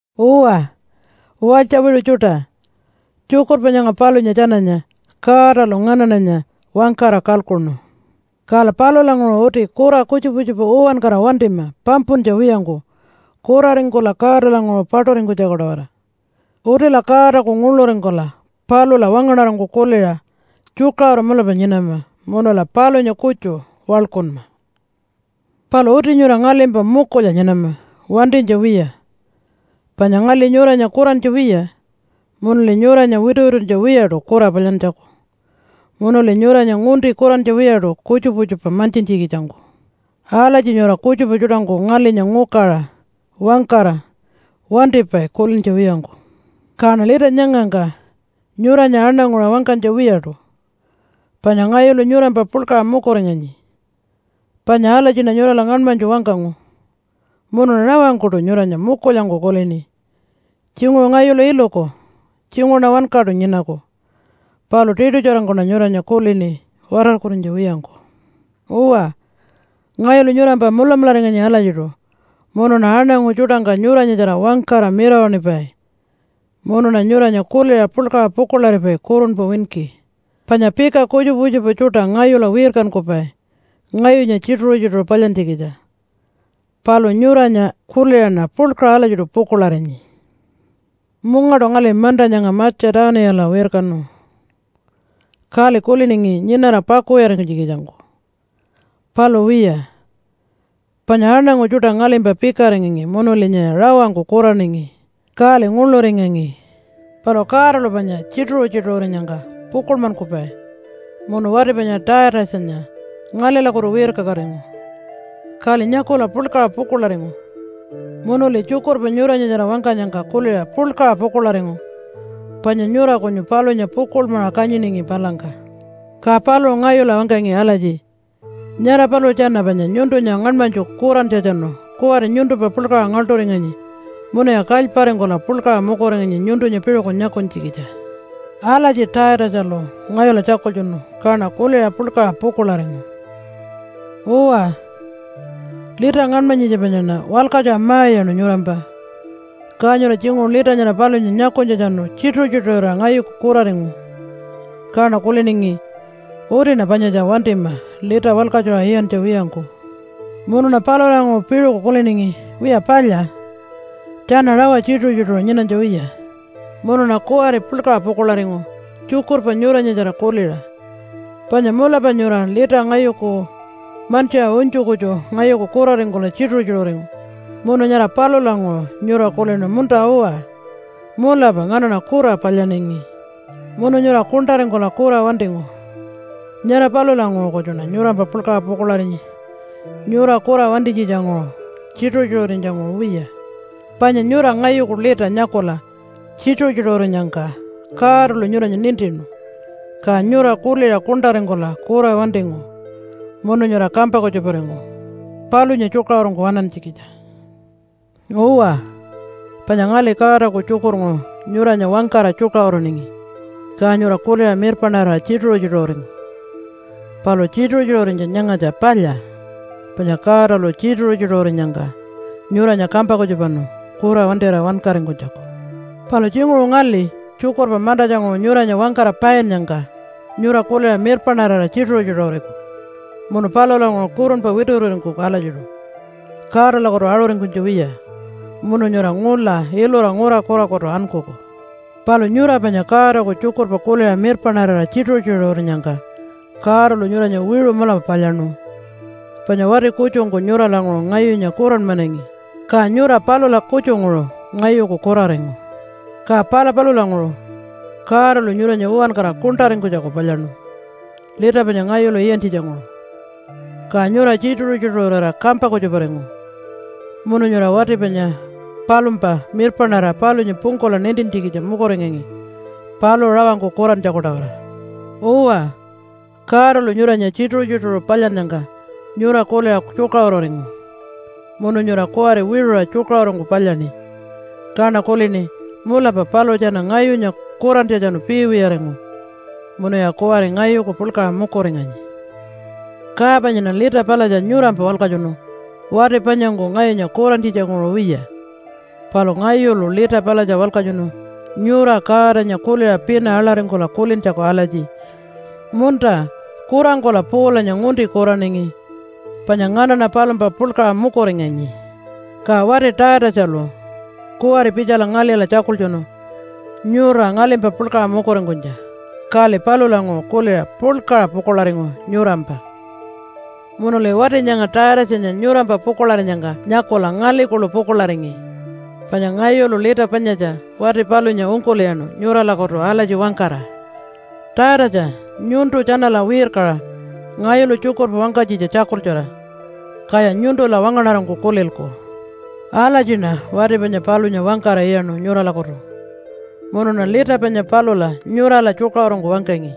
Uwa, walytja wiṟu tjuṯa! Tjukurpa nyanga palunya tjananya Godalu nganaṉanya wangkara kalkuṉu. Kala palulanguṟu uti kura kutjupa kutjupa uwankara wantima pampuntja wiyangku kuraringkula Godalanguṟu paṯuringkunytjaku-tawara. Utila Godaku nguḻuringkula palula wangaṉarangku kuliṟa tjukaṟuru mulapa nyinama munula palunya kutju waḻkunma. Palu uti nyura ngalimpa mukulya nyinama wantinytja wiya. Panya ngali nyuranya kurantja wiya, munuli nyuranya wituwituntja wiyaṯu kura palyantjaku, munuli nyuranya ngunti kurantja wiyaṯu kutjupa kutjupa mantjintjikitjangku. Alatji nyura kutjupa tjuṯangku ngalinya ngukaṟa wangkara wantipai kulintja wiyangku. Kaṉa lita nyangangka nyuranya aṉanguṟa wangkanytja wiyaṯu, panya ngayulu nyurampa puḻkaṟa mukuringanyi, panya alatjiṉa nyurala ngaṉmanytju wangkangu, munuṉa rawangkuṯu nyuranya mukulyangku kulini. Tjinguṟu ngayulu iluku, tjinguṟuṉa wankaṯu nyinaku, palu tiṯutjarangkuṉa nyuranya kulini watarkurinytja wiyangku. Uwa, ngayulu nyurampa mulamularinganyi alatjiṯu. Munuṉa aṉangu tjuṯangka nyuranyatjara wangkara mirawaṉipai munuṉa nyuranya kuliṟa puḻkaṟa pukuḻaripai kurunpa winki. Panya pika kutjupa kutjupa tjuṯa ngayula wirkankupai ngayunya tjituṟu-tjituṟu palyantjikitja, palu nyuranya kuliṟaṉa puḻkaṟa alatjiṯu pukuḻarinyi. Mungaṯu ngali manta nyanga Matja-tuniyala wirkanu, kali kuliningi nyinara pakuwiyaringkunytjikitjangku. Palu wiya, panya aṉangu tjuṯa ngalimpa pikaringangi munulinya rawangku kuraningi, kali nguḻuringangi. Palu Godalu panya tjituṟu-tjituṟurinyangka pukuḻmankupai munu wati panya Taitatjanya ngalilakutu wirkakatingu. Kali nyakula puḻkaṟa pukuḻaringu, munuli tjukurpa nyuranyatjara wangkanyangka kuliṟa puḻkaṟa pukuḻaringu, panya nyura kunyu palunya pukuḻmaṟa kanyiningi palangka. Ka paluṟu ngayula wangkangi alatji, “Nyara paluṟu tjana panya nyuntunya ngaṉmanytju kurantjatjanu kuwari nyuntumpa puḻkaṟa ngaḻṯuringanyi munuya kalyparingkula puḻkaṟa mukuringanyi nyuntunya piṟuku nyakunytjikitja.” Alatji Taitatjalu ngayula tjakultjunu kaṉa kuliṟa puḻkaṟa pukuḻaringu. Uwa, lita ngaṉmanyitja panyaṉa walkatjuṟa ma-iyaṉu nyurampa. Ka nyura tjinguṟu lita nyara palunya nyakunytjatjanu tjituṟu-tjituṟurira ngayuku kuraringu. Kaṉa kuliningi, “Utiṉa panyatja wantima lita walkatjuṟa iyantja wiyangku.” Munuṉa palulanguṟu piṟuku kuliningi, “Wiya palya, tjana rawa tjituṟu-tjituṟu nyinanytja wiya.” Munuṉa kuwari puḻkaṟa pukuḻaringu tjukurpa nyuranyatjara kuliṟa, panya mulapa nyura lita ngayuku mantjiṟa unytju kutju ngayuku kuraringkula tjituṟu-tjituṟuringu munu nyara palulanguṟu nyura kulinu, “Munta-uwa, mulapa nganaṉa kura palyaningi.” Munu nyura kuṉṯaringkula kura wantingu. Nyara palulanguṟu kutjuṉa nyurampa puḻkaṟa pukuḻarinyi nyura kura wantinytjitjanguṟu, tjituṟu-tjituṟurinytja-nguṟu wiya. Panya nyura ngayuku lita nyakula tjituṟu-tjituṟurinyangka Godalu nyuranya nintinu, ka nyura kuliṟa kuṉṯaringkula kura wantingu munu nyura kampa kutjuparingu palunya tjukaṟurungku waṉantjikitja. Uwa, panya ngali Godaku tjukurnguṟu nyuranya wangkara tjukaṟuruningi ka nyura kuliṟa mirpaṉarira tjituṟu-tjituṟuringu. Palu tjituṟu-tjituṟurinytja nyangatja palya, panya Godalu tjituṟu-tjituṟurinyangka nyuranya kampa kutjupanu kura wantira wankaringkunytjaku. Palu tjinguṟu ngali tjukurpa mantatjanguṟu nyuranya wangkara painnyangka nyura kuliṟa mirpaṉarira tjituṟu-tjituṟuriku munu palulanguṟu kurunpa wituwituringkuku alatjiṯu Godalakutu aṟuringkunytja wiya munu nyura ngula ilura ngura kurakutu ankuku. Palu nyura panya Godaku tjukurpa kuliṟa mirpaṉarira tjituṟu-tjituṟurinyangka Godalu nyuranya wiṟu mulapa palyaṉu. Panya wati kutjungku nyuralanguṟu ngayunya kuranmanangi, ka nyura palula kutjunguṟu ngayuku kuraringu. Ka pala palulanguṟu Godalu nyuranya uwankara kuṉṯaringkunytjaku palyaṉu lita panya ngayulu iyantjitjanguṟu. Ka nyura tjituṟu-tjituṟurira kampa kutjuparingu munu nyura wati panya palumpa mirpaṉarira palunya pungkula nintintjikitja mukuringangi paluṟu rawangku kurantjaku-tawara. Uwa, Godalu nyuranya tjituṟu-tjituṟu palyannyangka nyura kuliṟa tjukaṟururingu munu nyura kuwari wiṟuṟa tjukaṟurungku palyaṉi. Kaṉa kulini, “Mulapa paluṟu tjana ngayunya kurantjatjanu piiwiyaringu munuya kuwari ngayuku puḻkaṟa mukuringanyi.” Ka panyaṉa lita palatja nyurampa walkatjunu wati panyangku ngayunya kurantjitjanguṟu wiya. Palu ngayulu lita palatja walkatjunu nyura Godanya kuliṟa pina aḻaringkula kulintjaku alatji, “Munta, kurangkula Paulanya ngunti kuraningi, panya nganaṉa palumpa puḻkaṟa mukuringanyi.” Ka wati Taitatjalu kuwari pitjala ngalila tjakultjunu nyura ngalimpa puḻkaṟa mukuringkunytja. Kali palulanguṟu kuliṟa puḻkaṟa pukuḻaringu nyurampa. Munuli wati nyanga Taitatjanya nyurampa pukuḻarinyangka nyakula ngali kuḻu pukuḻaringi. Panya ngayulu lita panyatja wati palunya ungkul'iyaṉu nyuralakutu alatji wangkara, “Taitatja! Nyuntu tjanala wirkaṟa ngayulu tjukurpa wangkanytjitja tjakultjura, kaya nyuntula wangaṉarangku kulilku.” Alatjiṉa wati panya palunya wangkara iyaṉu nyuralakutu. Munuṉa lita panya palula nyurala tjukaṟurungku wangkangi,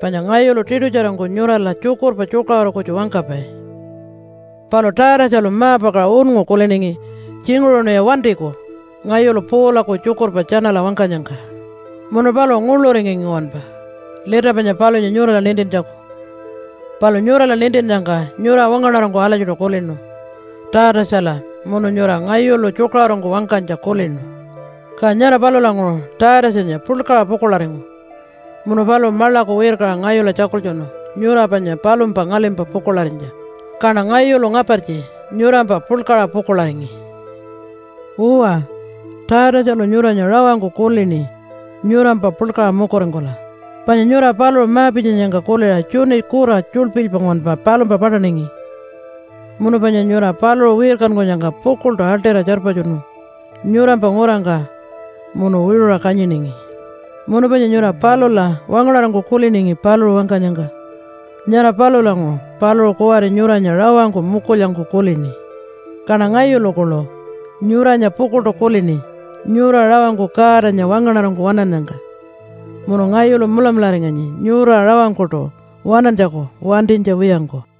panya ngayulu tiṯutjarangku nyurala tjukurpa tjukaṟuru kutju wangkapai. Palu Taitatjalu ma-pakaṟa unngu kuliningi, “Tjinguṟuṉiya wantiku ngayulu Paulaku tjukurpa tjanala wangkanyangka.” Munu paluṟu nguḻuringangi nguwanpa lita panya palunya nyurala nintintjaku. Palu nyurala nintinnyangka nyura wangaṉarangku alatjiṯu kulinu Taitatjala, munu nyura ngayulu tjukaṟurungku wangkanytja kulinu. Ka nyara palulanguṟu Taitatjanya puḻkaṟa pukuḻaringu, munu paluṟu maḻaku wirkaṟa ngayula tjakultjunu nyura panya palumpa ngalimpa pukuḻarinytja. Kaṉa ngayulu ngapartji nyurampa puḻkaṟa pukuḻaringi. Uwa, Taitatjalu nyuranya rawangku kulini nyurampa puḻkaṟa mukuringkula, panya nyura paluṟu ma-pitjanyangka kuliṟa tjuni kura tjulpilypa nguwanpa palumpa paṯaningi. Munu panya nyura paluṟu wirkankunyangka pukuḻṯu aḻṯira tjarpatjunu nyurampa ngurangka munu wiṟuṟa kanyiningi. Munu panya nyura palula wangaṉarangku kuliningi paluṟu wangkanyangka. Nyara palulanguṟu paluṟu kuwari nyuranya rawangku mukulyangku kulini. Kaṉa ngayulu kuḻu nyuranya pukuḻṯu kulini nyura rawangku Godanya wangaṉarangku waṉannyangka munu ngayulu mulamularinganyi nyura rawangkuṯu waṉantjaku wantinytja wiyangku.